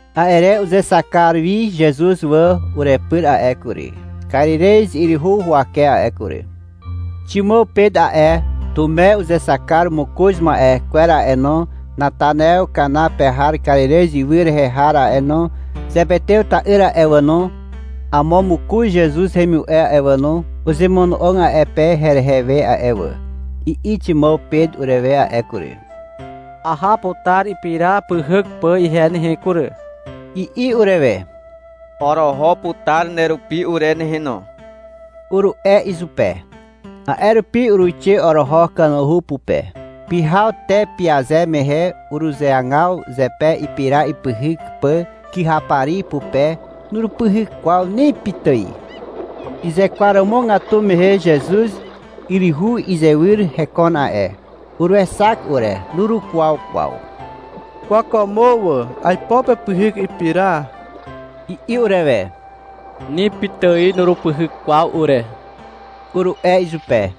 A'e re uzexak kar wi Zezuz wà urepyr a'e kury, Karirez yryhu huwake a'e kury. Ximàw Pet a'e, Tume uzexak kar mokoz ma'e kwer a'e no, Natanaew Kana pe har Karirez ywy rehe har a'e no, Zepetew ta'yr a'e wà no, amo mokoz Zezuz hemimu'e a'e wà no, uzemono'og a'e pe herehe we a'e wà. I'i Ximàw Pet urewe a'e kury. — Aha putar ipira pyhyk pà ihe nehe kury, i'i urewe. — Oroho putar nerupi ure nehe no, uru'e izupe. A'e rupi uruixe oroho kanuhu pupe. Pyhaw te pyaze mehe uruzeagaw zepe ipira ipyhyk pà kyhapari pupe. Nurupyhyk kwaw ni pitài. Uzekwaromogatu mehe Zezuz yryhu izywyr hekon a'e. Uruexak ure. Nurukwaw kwaw. — Kwàkwàmo wà, aipo pepyhyk ipira, i'i urewe. — Ni pitài nurupyhyk kwaw ure, uru'e izupe.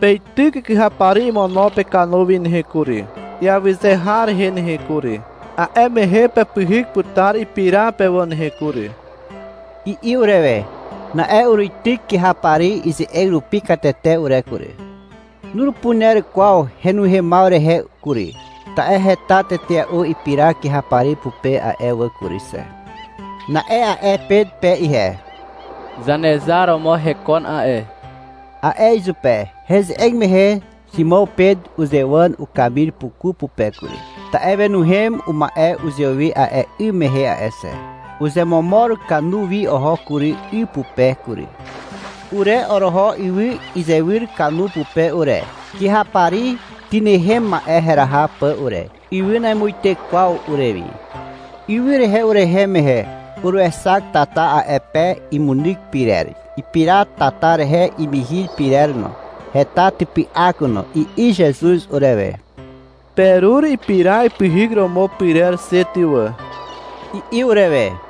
— Peityk kyhapari imono pekanu wi nehe kury, iawyze har rehe nehe kury. A'e mehe pepyhyk putar ipira pe wà nehe kury, i'i urewe. Na'e uruityk kyhapari ize'eg rupi katete ure kury. Nurupuner kwaw henuhemaw rehe kury, ta'e heta tetea'u ipira kyhapari pupe a'e wà kury xe. Na'e a'e Pet pe ihe. — Zanezar romo hekon a'e, a'e izupe. Heze'eg mehe Ximàw Pet uzewàn ukamir puku pupe kury (ta'e wenuhem uma'e uzewi a'e 'ym mehe a'e xe). Uzemomor kanu wi oho kury, 'y pupe kury. Ure oroho ywy izywyr kanu pupe ure, kyhapari tynehem ma'e heraha pà ure. Ywy namuite kwaw urewi. Ywy rehe urehem mehe, uruexak tata a'e pe imunyk pyrer. Ipira tata rehe imihir pyrer no. Heta typy'ak no. I'i Zezuz urewe. — Perur ipira ipyhyk romo pyrer xe ty wà, i'i urewe.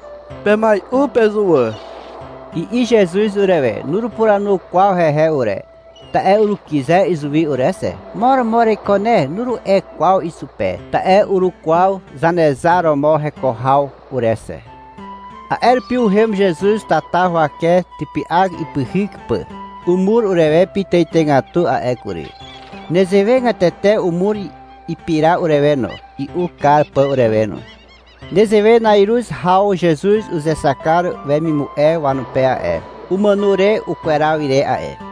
— Pemai'u pezuwà, i'i Zezuz urewe. Nurupuranu kwaw hehe ure, ta'e urukyze izuwi ure xe. — Mo romo ereiko ne, nuru'e kwaw izupe, ta'e urukwaw Zanezar romo heko haw ure xe. A'e rupi uhem Zezuz tata huwake typy'ak ipyhyk pà. Umur urewe pitàitàigatu a'e kury. Nezewegatete umur ipira urewe no, i'u kar pà urewe no. Nezewe na'iruz haw Zezuz uzexak kar wemimu'e wanupe a'e, umàno re ukweraw ire a'e.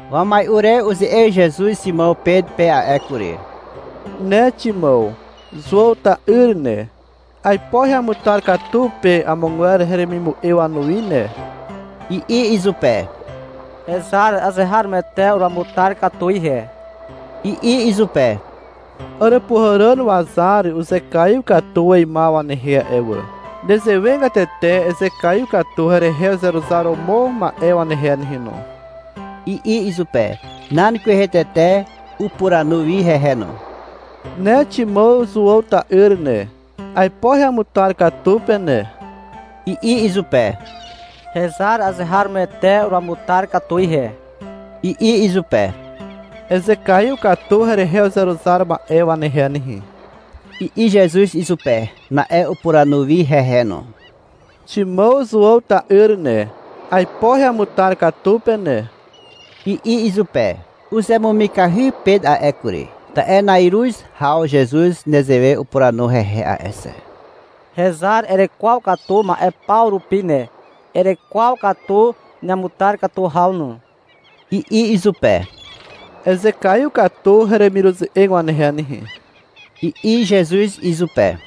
Wamai'u re uze'eg Zezuz Ximàw Pet pe a'e kury. — Ne Ximàw, Zuàw ta'yr ne. Aipo heamutar katu pe amogwer heremimu'e wanuwi ne, i'i izupe. — Hezar, azeharomoete uruamutar katu ihe, i'i izupe. — Àràpuhàràn wazar uzekaiw katu weimaw wanehe a'e wà. Nezewegatete ezekaiw katu herehe uzeruzar romo ma'e wanehe nehe no, i'i izupe. Nan kwehe tete upuranu wi hehe no. — Ne Ximàw Zuàw ta'yr ne, aipo heamutar katu pe ne, i'i izupe. — Hezar, azeharomoete uruamutar katu ihe, i'i izupe. — Ezekaiw katu herehe uzeruzar ma'e wanehe nehe, i'i Zezuz izupe. Na'e upuranu wi hehe no. — Ximàw Zuàw ta'yr ne, aipo heamutar katu pe ne, i'i izupe. Uzemumikahy Pet a'e kury, ta'e na'iruz haw Zezuz nezewe upuranu hehe a'e xe. — Hezar erekwaw katu ma'e paw rupi ne. Erekwaw katu neamutar katu haw no, i'i izupe. — Ezekaiw katu heremiruze'eg wanehe nehe, i'i Zezuz izupe.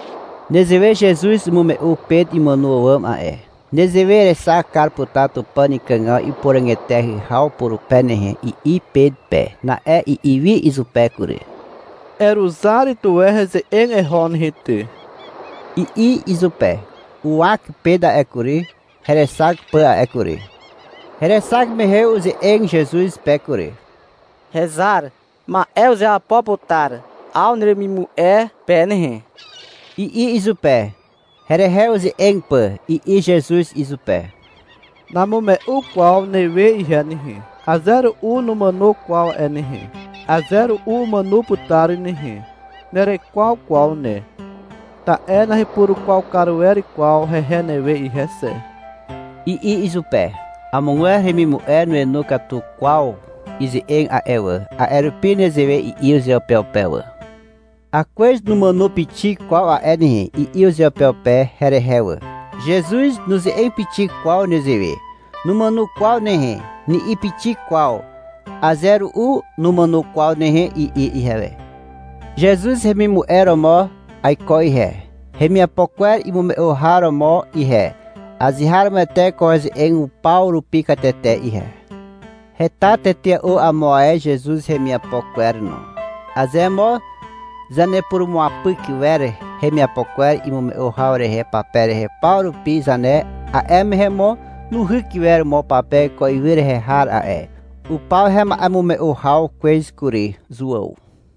(Nezewe Zezuz umume'u Pet imàno àwàm a'e.) — Nezewe erexak kar putar Tupàn ikàgaw ipuràg eteahy haw purupe nehe, i'i Pet pe. Na'e i'i wi izupe kury. — Eruzar tuwe heze'eg eho nehe ty, i'i izupe. Uwak Pet a'e kury, herexak pà a'e kury. Herexak mehe uze'eg Zezuz pe kury. — Hezar, ma'e uzeapo putar 'aw neremimu'e pe nehe, i'i izupe, herehe uze'eg pà. I'i Zezuz izupe, — Namume'u kwaw newe ihe nehe. Aze ru'u numàno kwaw a'e nehe. (Aze ru'u umàno putar nehe.) Nerekwaw kwaw ne, ta'e nahepurukwaw kar wer kwaw hehe newe ihe xe, i'i izupe. Amogwer hemimu'e nuenu katu kwaw ize'eg a'e wà, a'e rupi nezewe i'i uzeupeupe wà. — Akwez numàno pixik kwaw a'e nehe, i'i uzeupeupe herehe wà. Zezuz nuze'eg pixik kwaw nezewe. — Numàno kwaw nehe, ni'i pixik kwaw. — Aze ru'u numàno kwaw nehe, i'i ihewe. Zezuz hemimu'e romo aiko ihe, hemiapo kwer imume'u har romo ihe. Azeharomoete ko heze'eg paw rupi katete ihe. Heta tetea'u amo ae Zezuz hemiapo kwer no. Aze mo zanepurumuapyk wer hemiapo kwer imume'u haw rehe pape rehe paw rupi zane, a'e mehe mo nuhyk iwer mo pape ko ywy rehe har a'e. Upaw hema'emume'u haw kwez kury. Zuàw.